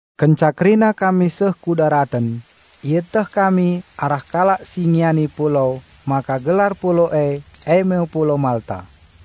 Kenca kerina kami seh ku daraten, ieteh kami arah kalak si ngiani pulau maka gelar pulau e, eme pulau Malta.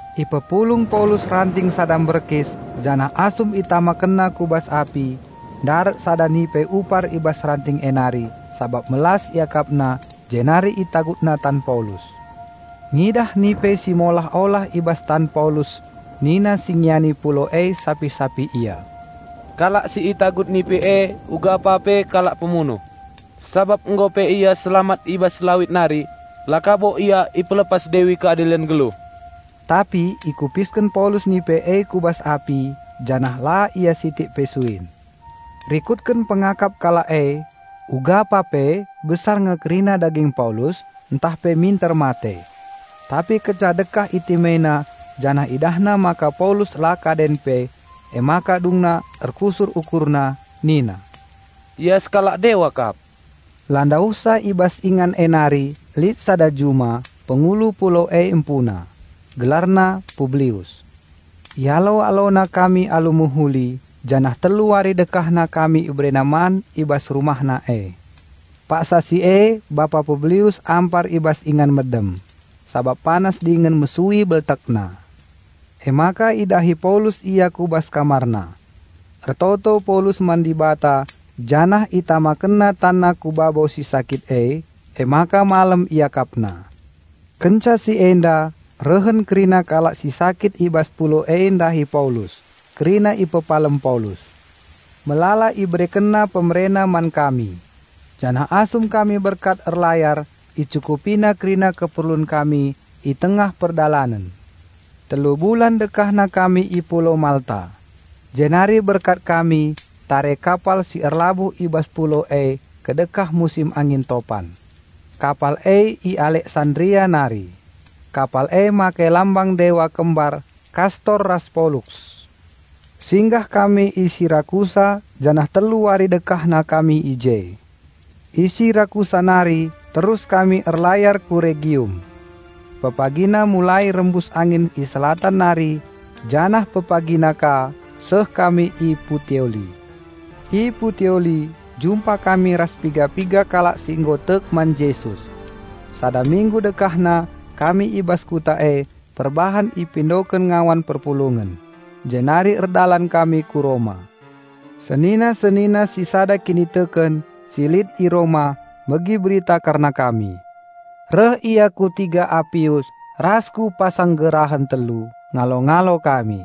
Ipepulung Paulus ranting sada mberkis janah asum itamakenna ku bas api, ndarat sada nipe upar i bas ranting e nari sabap melas iakapna jenari itagutna tan Paulus. Ngidah nipe si molah-olah i bas tan Paulus nina si ngiani pulau e sapih-sapih ia, "Kalak si itagut nipe e ugapa pe kalak pemunuh. Sabap nggo pe ia selamat i bas lawit nari la ka bo ia ipelepas Dewi Keadilen nggeluh." Tapi ikupisken Paulus nipe e ku bas api, janah la ia sitik pe suin. Rikutken pengakap kalak e ugapa pe besar nge kerina daging Paulus ntah pe minter mate. Tapi kenca ndekah itimaina janah idahna maka Paulus la kaden pe emaka dungna erkusur ukurna, nina, "Ia sekalak dewa kap." La ndauhsa i bas ingan e nari lit sada juma, pengulu pulau e empuna. Gelarna Publius. Ialo-alona kami alu mehuli janah telu wari dekahna kami iberena man i bas rumahna e. Paksa si e bapa Publius ampar i bas ingan medem, sabap panas dingen mesui beltekna. Emaka idahi Paulus ia ku bas kamarna. Ertoto Paulus man Dibata janah itamakenna tanna ku babo si sakit e. Emaka malem iakapna. Kenca si enda rehen kerina kalak si sakit i bas pulau e ndahi Paulus. Kerina ipepalem Paulus. Melala iberekenna pemerena man kami. Janah asum kami berkat erlayar icukupina kerina keperlun kami i tengah perdalanen. Telu bulan dekahna kami i pulau Malta. Jenari berkat kami tare kapal si erlabuh i bas pulau e kedekah musim angin topan. Kapal e i Aleksandria nari. Kapal e make lambang dewa kembar Kastor ras Poluks. Singgah kami i Sirakusa janah telu wari dekahna kami i je. I Sirakusa nari terus kami erlayar ku Regium. Pepagina mulai rembus angin i Selatan nari, janah pepagina ka seh kami i Puteoli. I Puteoli jumpa kami ras piga-piga kalak si nggo tek man Jesus. Sada minggu dekahna kami i bas kuta e perbahan ipindoken ngawan perpulungen. Jenari erdalan kami ku Roma. Senina-senina si sada kiniteken si lit i Roma megi berita kerna kami. Reh ia ku tiga Apius ras ku Pasanggerahan Telu ngalo-ngalo kami.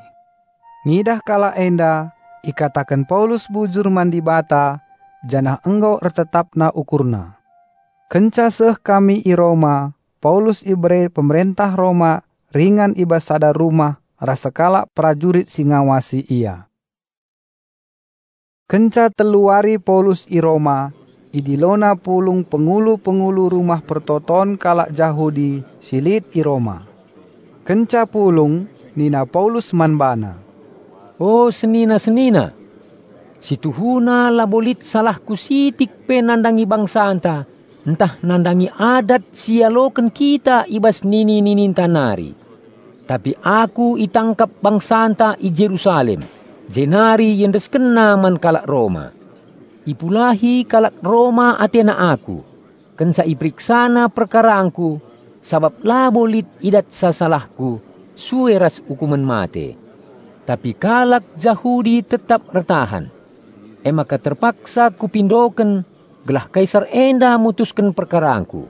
Ngidah kalak enda, ikataken Paulus bujur man Dibata, janah nggo ertetapna ukurna. Kenca seh kami i Roma, Paulus ibere pemerentah Roma ringan i bas sada rumah ras sekalak perajurit si ngawasi ia. Kenca telu wari Paulus i Roma idilona pulung pengulu-pengulu rumah persembahen kalak Jahudi si lit i Roma. Kenca pulung nina Paulus man bana, "O senina-senina! Si tuhuna labo lit salahku sitik pe nandangi bangsanta ntah nandangi adat si ialoken kita i bas nini-nininta nari. Tapi aku itangkap bangsanta i Jerusalem jenari iendeskenna man kalak Roma. Ipulahi kalak Roma atena aku kenca iperiksana perkarangku sabap labo lit idatsa salahku sue ras ukumen mate. Tapi kalak Jahudi tetap ertahan. Emaka terpaksa kupindoken gelah Kaisar enda mutusken perkarangku.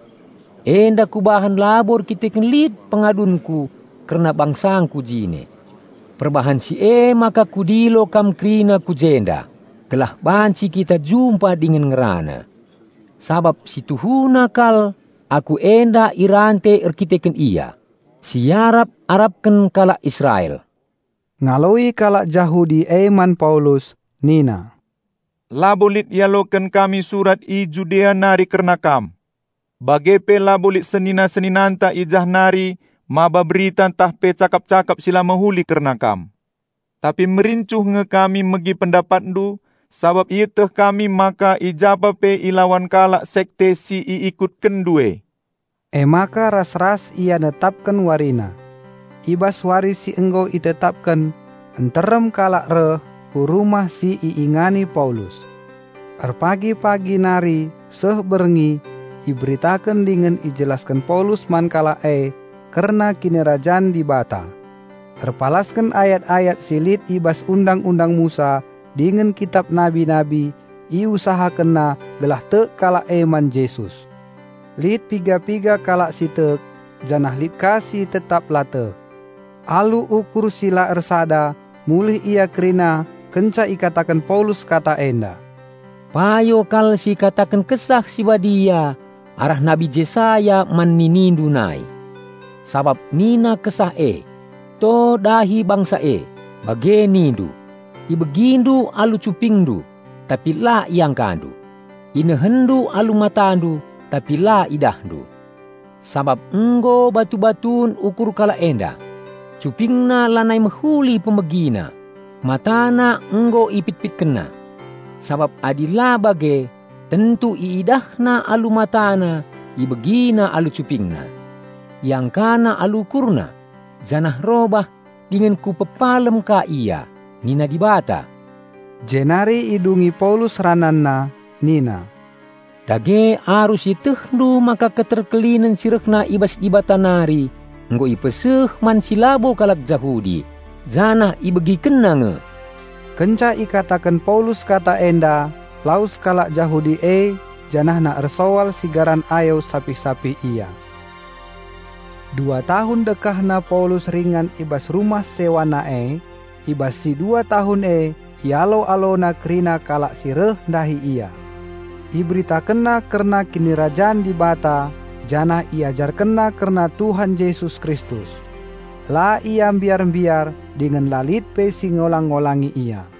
Enda kubahan labo erkiteken lit pengadunku kerna bangsangku jine. Perbahan si e maka kudilo kam kerina ku jenda, gelah banci kita jumpa dingen ngerana. Sabap si tuhuna kal aku enda irante erdandanken Ia, si iarap-arapken kalak Israel." Ngaloi kalak Jahudi e man Paulus nina, "Labo lit ialoken kami surat i Judea nari kerna kam. Bage pe labo lit senina-seninanta i jah nari maba berita tah pe cakap-cakap si la mehuli kerna kam. Tapi merincuh nge kami megi pendapatndu sabap ieteh kami maka i japa pe ilawan kalak sekte si i ikutkenndu e." Emaka ras-ras ia netapken warina. I bas wari si nggo itetapken nterem kalak reh ku rumah si iingani Paulus. Erpagi-pagi nari seh berngi iberitaken dingen ijelasken Paulus man kalak e kerna Kinirajan Dibata. Erpalasken ayat-ayat si lit i bas Undang-undang Musa dingen kitap nabi-nabi iusahakenna gelah tek kalak e man Jesus. Lit piga-piga kalak si tek janah lit ka si tetap la tek. Alu ukur si la ersada mulih ia kerina kenca ikataken Paulus kata enda, "Payo kal si ikataken Kesah Si Badia arah nabi Jesaya man ninindu nai. Sabap nina Kesah e, 'To dahi bangsa e, bage nindu: Ibegindu alu cupingndu tapi la iangkandu, inehenndu alu matandu tapi la idahndu. Sabap nggo batu-batun ukur kalak enda, cupingna lanai mehuli pemegina matana nggo ipitpitkenna. Sabap adi la bage, tentu iidahna alu matana ibegina alu cupingna, iangkana alu ukurna, janah robah dingen Kupepalem ka ia, nina Dibata.'" Jenari idungi Paulus rananna nina, "Dage arus ietehndu maka keterkelinen si rehna i bas Dibata nari nggo ipeseh man si labo kalak Jahudi janah ibegikenna nge!" (Kenca ikataken Paulus kata enda, lawes kalak Jahudi e janahna ersoal sigaran ayo sapih-sapih ia.) Dua tahun dekahna Paulus ringan i bas rumah sewana e. I bas si dua tahun e ialo-alona kerina kalak si reh ndahi ia. Iberitakenna kerna Kinirajan Dibata janah i ajarkenna kerna Tuhan Jesus Kristus. La ia mbiar-mbiar dingen la lit pe si ngolang-ngolangi ia.